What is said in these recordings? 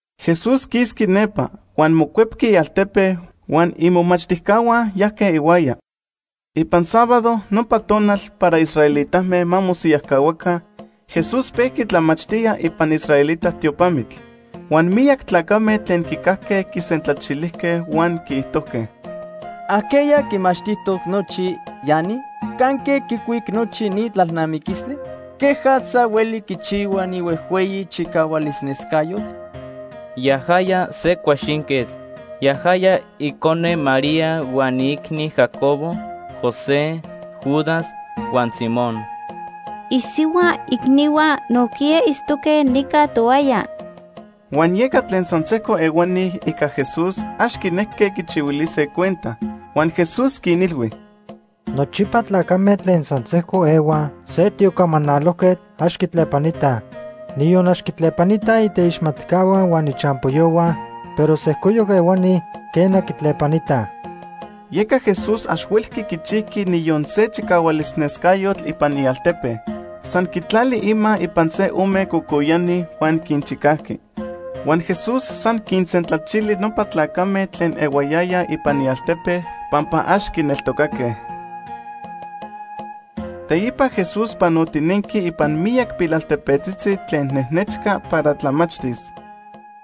Jesús quisqui nepa huan mocuepqui ialtepe huan imomachtijcahua yajque ihuaya. Ipan sábado, nopa tonal para israelitame ma mosiyajcahuaca, Jesús pejqui tlamachtía ipan israelita tiopamitl. Huan miyac tlacame tlen quicajque quisentlachilijque huan quiijtojque: ―¿Ajqueya quimachtijtoc nochi ya ni? ¿Canque quicuic nochi ni tlalnamiquistli? ¿Quejatza hueli quichihua ni huejhueyi chicahualis nescayotl? Yajaya se cuaxinquetl. Yajaya icone María huan iicni Jacobo, José, Judas, huan Simón. Isihua icnihua nojquiya itztoque nica tohuaya. Huan yeca tlen san sejco ehuani ica Jesús ax quinejque quichihuilise cuenta. Huan Jesús quinilhui: ―Nochipa tlacame tlen san sejco ehuaj se tiocamanalojquetl ax quitlepanitaj. Niyon ax quitlepanitaj iteixmatcahua huan ichampoyohua, pero sejcoyoc ehuani, quena, quitlepanitaj. Yeca Jesús ax huelqui quichijqui niyon se chicahualis nescayotl ipan ialtepe. San quitlali ima ipan se ome cocoyani huan quinchicajqui. Huan Jesús san quinsentlachili nopa tlacame tlen ehuayaya ipan ialtepe pampa ax quineltocaque. Teipa Jesús panotinenqui ipan miyac pilaltepetzitzi tlen nejnechca para tlamachtis.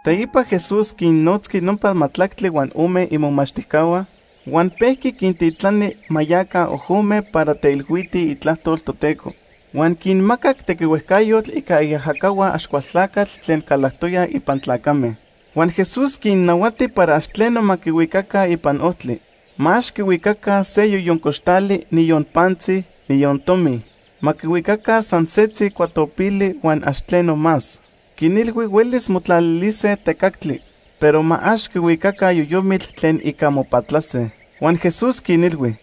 Teipa Jesús quinnotzqui nopa majtlactli huan ome imomachtijcahua huan pejqui quintitlani ma yaca ojome para teilhuitij itlajtol Toteco. Huan quinmacac tequihuejcayotl ica iajacahua Axcualtlacatl tlen calactoya ipan tlacame. Huan Jesús quinnahuati para ax tleno ma quihuicaca ipan ojtli. Ma ax quihuicaca se yoyon coxtali, niyon pantzi, niyon tomi. Ma quihuicaca san setzi cuatopili huan ax tleno más. Quinilhui huelis motlalilise tecactli, pero ma ax quihuicaca yoyomitl tlen ica mopatlase. Huan Jesús quinilhui: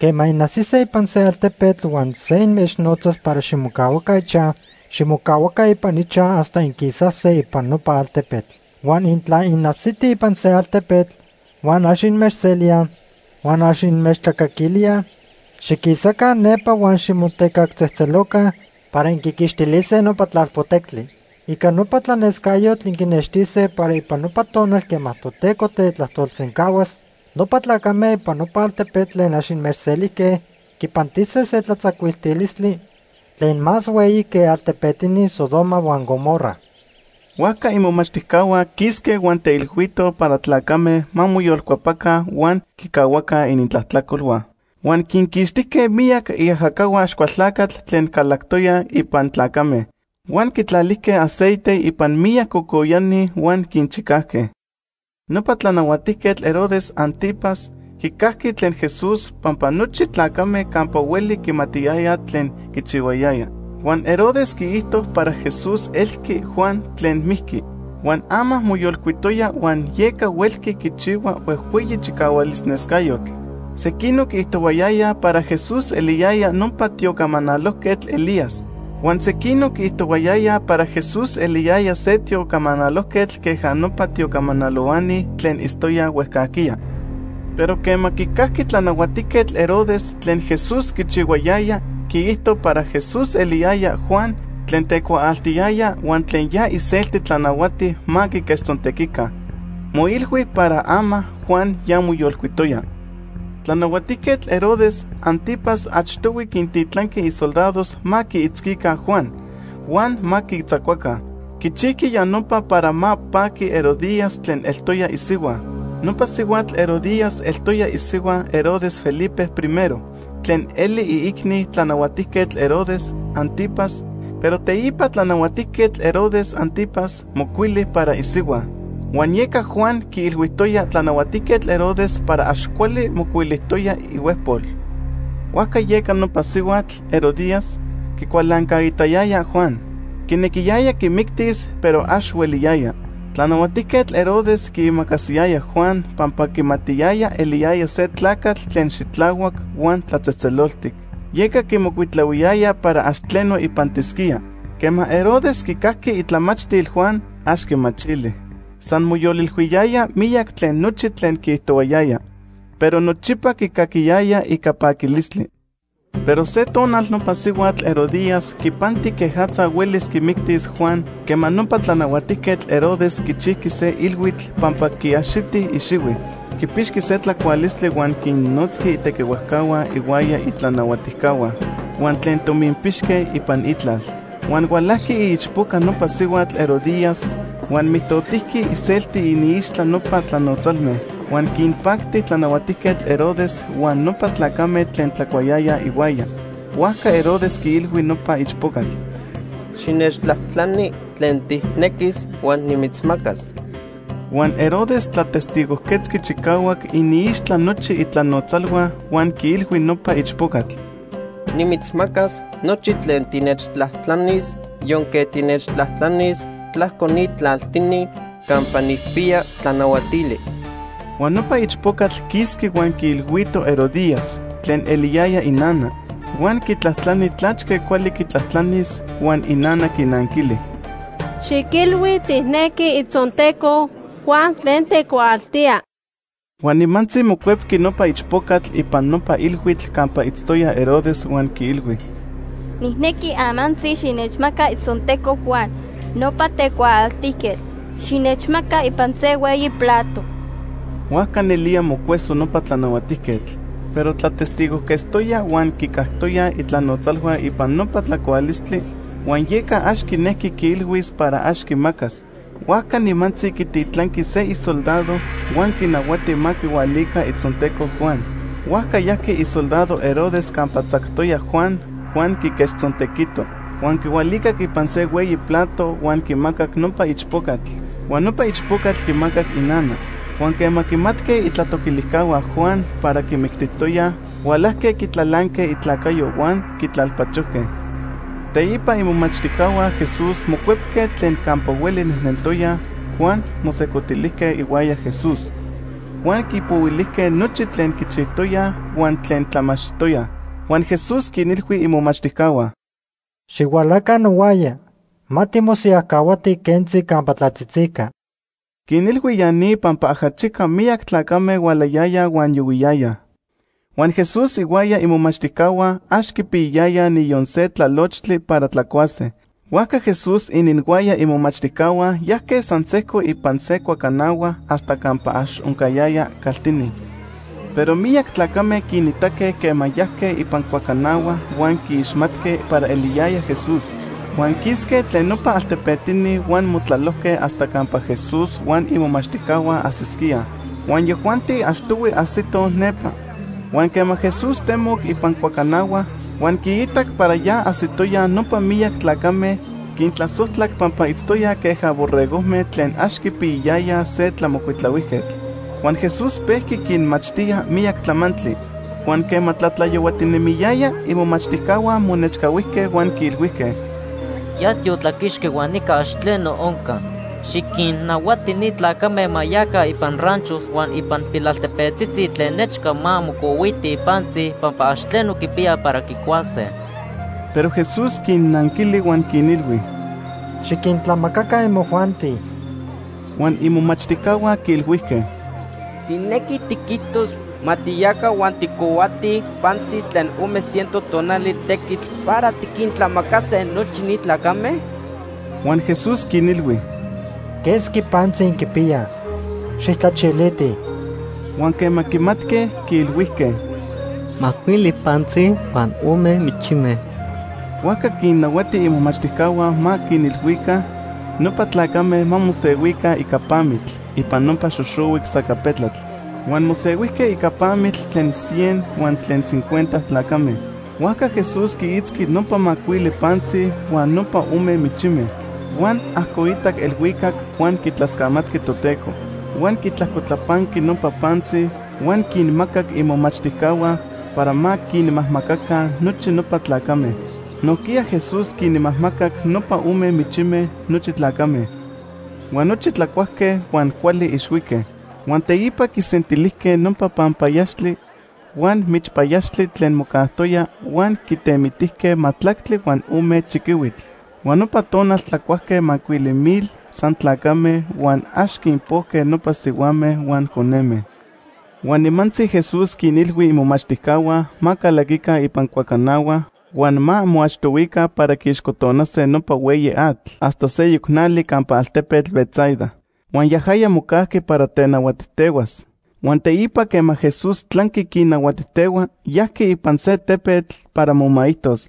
―Quema inajsise ipan se altepetl huan se inmechnotzas para ximocahuaca ichaj, ximocahuaca ipan ichaj hasta inquisase ipan nopa altepetl. Huan intla inajsitij ipan se altepetl, huan ax inmechselíaj huan ax inmechtlacaquilíaj; xiquisaca nepa huan ximotecactzejtzeloca para inquiquixtilise nopa tlalpotectli. Ica nopa tlanescayotl inquinextise para ipan nopa tonal quema Toteco tetlajtolsencahuas, nopa tlacame ipan nopa altepetl tlen ax inmechselijque quipantise se tlatzacuiltilistli tlen más hueyi que altepetini Sodoma huan Gomorra. Huajca imomachtijcahua quisque huan teilhuitoj para tlacame ma moyolcuepaca huan quicahuaca inintlajtlacolhua. Huan quinquixtijque miyac iajacahua Axcualtlacatl tlen calactoyaj ipan tlacame, huan quitlalijque aceite ipan miyac cocoyani huan quinchicajque. Nopa Tlanahuatijquetl Herodes Ántipas quicajqui tlen Jesús pampa nochi tlacame campa hueli quimatiyayaj tlen quichihuayaya. Huan Herodes quiijto para Jesús elqui Juan tlen mijqui, huan ama moyolcuitoya huan yeca huelqui quichihua huejhueyi chicahualis nescayotl. Sequinoc quiijtohuayayaj para Jesús eliyaya nopa tiocamanalojquetl Elías. Huan sequinoc quiijtohuayayaj para Jesús eliyaya se tiocamanalojquetl queja nopa tiocamanalohuani tlen itztoyaj huejcajquiya. Pero quema quicajqui Tlanahuatijquetl Herodes tlen Jesús quichihuayaya, quiijto para Jesús eliyaya Juan tlen tecuaaltiyaya huan tlen ya iselti tlanahuati ma quiquechtzontequica. Moilhui para ama Juan ya moyolcuitoya. Tlanahuatijquetl Herodes Ántipas achtohui quintitlanqui isoldados ma quiitzquica Juan huan ma quitzacuaca. Quichijqui ya nopa para ma paqui Herodías tlen eltoya isihua. Nopa sihuatl Herodías eltoya isihua Herodes Felipe I tlen eli iicni Tlanahuatijquetl Herodes Ántipas, pero teipa Tlanahuatijquetl Herodes Ántipas mocuili para isihua. Huan yeca Juan quiilhuijtoya Tlanahuatijquetl Herodes para ax cuali mocuilijtoya ihuejpol. Huajca yeca nopa sihuatl, Herodías, quicualancaitayaya Juan. Quinequiyaya quimictis, pero ax hueliyaya. Tlanahuatijquetl Herodes quiimacasiyaya Juan pampa quimatiyaya eliyaya se tlacatl tlen xitlahuac huan tlatzejtzeloltic, yeca quimocuitlahuiyaya para ax tleno ipantisquía. Quema Herodes quicajqui itlamachtil Juan, ax quimachili. San moyolilhuiyaya miyac tlen nochi tlen quiijtohuayaya. Pero nochipa quicaquiyaya ica paquilistli. Pero se tonal nopa sihuatl Herodías quipanti quejatza huelis quimictis Juan quema nopa Tlanahuatijquetl Herodes quichijqui se ilhuitl pampa quiaxiti ixihui. Quipixqui se tlacualistli huan quinnotzqui itequihuejcahua ihuaya itlanahuatijcahua huan tlen tominpixque ipan itlal. Huan hualajqui iichpoca nopa sihuatl Herodías huan mijtotijqui iselti iniixtla nopa tlanotzalme. Huan quinpacti Tlanahuatijquetl Herodes huan nopa tlacame tlen tlacuayayaj ihuaya. Huajca Herodes quiilhui nopa ichpocatl: ―Xinechtlajtlani tlen tijnequis huan nimitzmacas. Huan Herodes tlatestigojquetzqui chicahuac iniixtla nochi itlanotzalhua huan quiilhui nopa ichpocatl: ―Nimitzmacas nochi tlen tinechtlajtlanis yonque tinechtlajtlanis tlajco ni tlaltini campa nijpiya tlanahuatili. Huan nopa ichpocatl quisqui huan quiilhuito Herodías, tlen eliyaya inana, huan quitlajtlani tlachque cuali quitlajtlanis. Huan inana quinanquili: ―Xiquilhui tijnequi itzonteco Juan tlen tecuaaltía. Huan nimantzi mocuepqui nopa ichpocatl ipan nopa ilhuitl campa itztoya Herodes huan quiilhui: ―Nijnequi amantzi xinechmaca itzonteco Juan, nopa tecuaaltijquetl. Xinechmaca ipan se hueyi plato. Huajca nelía mocueso nopa tlanahuatijquetl. Pero tlatestigojquetztoya huan quicactoyaj itlanotzalhua ipan nopa tlacualistli huan yeca ax quinejqui quiilhuis para ax quimacas. Huajca nimantzi quititlanqui se isoldado, huan quinahuati ma quihualica itzonteco Juan. Huajca yajqui isoldado Herodes campa tzactoya Juan huan quiquechtzontequito. Huan quihualicac ipan se hueyi plato, huan quimacac nopa ichpocatl, huan nopa ichpocatl quimacac inana. Huan quema quimatque itlatoquilijcahua Juan para quimictijtoyaj, hualajque quitlalanque itlacayo huan quitlalpachojque. Teipa imomachtijcahua Jesús mocuepque tlen campa hueli nejnentoyaj huan mosejcotilijque ihuaya Jesús. Huan quipohuilijque nochi tlen quichijtoyaj huan tlen tlamachtijtoyaj. Huan Jesús quinilhui imomachtijcahua: ―Xihualaca nohuaya ma timosiyajcahuatij quentzi campa tlatzitzica. Quinilhui ya ni pampa ajachica miyac tlacame hualayayaj huan yohuiyayaj, huan Jesús ihuaya imomachtijcahua ax quipiyayayaj niyon se tlalochtli para tlacuase. Huajca Jesús ininhuaya imomachtijcahua yajque san sejco ipan se cuacanahua hasta campa ax oncayaya caltini. Pero miyac tlacame quinitaque quema yajque ipan cuacanahua huan quiixmatque para eliyaya Jesús. Huan quisque tlen nopa altepetini huan motlalojque hasta campa Jesús huan imomachtijcahua ajsisquíaj, huan yajuanti achtohui ajsitoj nepa. Huan quema Jesús temoc ipan cuacanahua huan quiitac para ya ajsitoyaj nopa miyac tlacame, quintlasojtlac pampa itztoyaj queja borregojme tlen ax quipiyayayaj se tlamocuitlahuijquetl. Huan Jesús pejqui quinmachtía miyac tlamantli. Huan quema tlatlayohuatinemiyaya, imomachtijcahua monechcahuijque huan quiilhuijque: ―Ya tiotlaquixqui huan nica ax tleno onca. Xiquinnahuati ni tlacame ma yaca ipan ranchos huan ipan pilaltepetzitzi tlen nechca ma mocohuitij pantzi pampa ax tleno quipiyaj para quicuase. Pero Jesús quinnanquili huan quinilhui: ―Xiquintlamacaca imojuanti. Huan imomachtijcahua quiilhuijque: ―¿Tijnequi tiquijtos ma tiyaca huan tijcohuatij pantzi tlen ome ciento tonali tequitl para tiquintlamacase nochi ni tlacame? Huan Jesús quinilhui: ―¿Quesqui pantzi inquipiyaj? Xijtlachilitij. Huan quema quimatque, quiilhuijque: ―Macuili pantzi huan ome michime. Huajca quinnahuati imomachtijcahua ma quinilhuica nopa tlacame ma mosehuica ica pamitl ipan nopa xoxohuic sacapetlatl. Huan mosehuijque ica pamitl tlen cien huan tlen cincuenta tlacame. Huajca Jesús quiitzqui nopa macuili pantzi huan nopa ome michime. Huan ajcoitac elhuicac huan quitlascamatqui Toteco. Huan quitlajcotlapanqui nopa pantzi huan quinmacac imomachtijcahua para ma quinmajmacaca nochi nopa tlacame. Nojquiya Jesús quinmajmacac nopa ome michime nochi tlacame. Huan nochi tlacuajque huan cuali ixhuique. Huan teipa quisentilijque nopa panpayaxtli huan michpayaxtli tlen mocajtoya huan quitemitijque majtlactli huan ome chiquihuitl. Huan nopa tonal tlacuajque macuili mil san tlacame huan ax quinpojque nopa sihuame huan coneme. Huan nimantzi Jesús quinilhui imomachtijcahua ma calaquica ipan cuacanahua huan ma moachtohuica para quiixcotonase nopa hueyi atl hasta seyoc nali campa altepetl Betsaida. Huan yajaya mocajqui para tenahuatijtehuas. Huan teipa quema Jesús tlanqui quinnahuatijtehua, yajqui ipan se tepetl para momaijtos.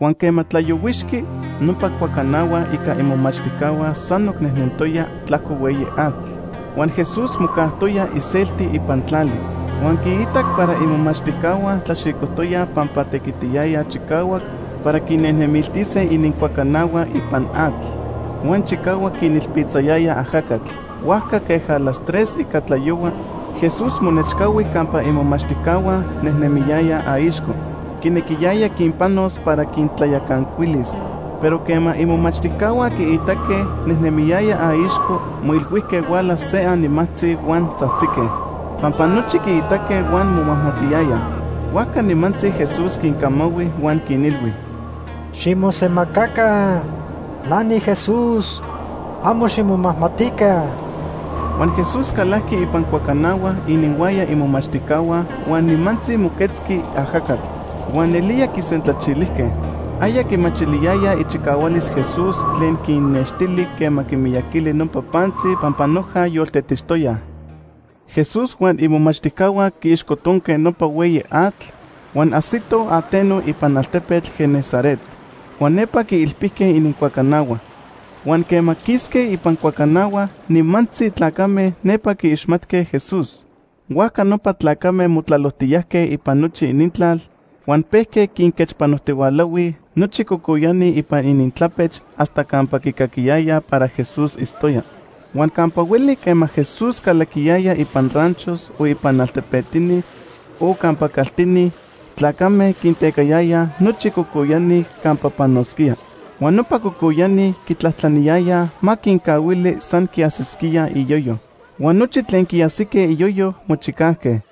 Huan quema tlayohuixqui, nopa cuacanahua ica imomachtijcahua sanoc nejnentoya tlajco hueyi atl, huan Jesús mocajtoya iselti ipan tlali. Huan quiitac para imomachtijcahua tlaxicojtoyaj pampa tequitiyayaj chicahuac para quinejnemiltise inincuacanahua ipan atl huan chicahuac quinilpitzayaya ajacatl. Huajca queja las tres ica tlayohua, Jesús monechcahui campa imomachtijcahua, nejnemiyaya aixco. Quinequiyaya quinpanos para quintlayacancuilis. Pero quema imomachtijcahua quiitaque nejnemiyaya aixco, moilhuijque huala se animajtzi huan tzajtzique, pampa nochi quiitaque huan momajmatiyayaj. Huajca nimantzi Jesús quincamahui huan quinilhui: ―Ximosemacaca. Na niJesús. Amo ximomajmatica. Huan Jesús calajqui ipan cuacanahua ininhuaya imomachtijcahua huan nimantzi moquetzqui ajacatl, huan nelía quisentlachilijque. Aya quimachiliyayaj ichicahualis Jesús tlen quinnextili quema quimiyaquili nopa pantzi pampa noja yoltetixtoyaj. Jesús huan imomachtijcahua quiixcotonque nopa hueyi atl huan ajsitoj ateno ipan altepetl Genesaret. Huan nepa quiilpijque inincuacanahua. Huan quema quisque ipan cuacanahua, nimantzi tlacame nepa quiixmatque Jesús. Huajca nopa tlacame motlalojtiyajque ipan nochi inintlal huan pejque quinquechpanojtihualahuij nochi cocoyani ipan inintlapech hasta campa quicaquiyayaj para Jesús itztoya. Huan campa hueli quema Jesús calaquiyaya ipan ranchos o ipan altepetini o campa caltini, tlacame quintecayayaj nochi cocoyani campa panosquía. Huan nopa cocoyani quitlajtlaniyayaj ma quincahuili san quiajsisquíaj iyoyo, huan nochi tlen quiajsique iyoyo, mochicajque.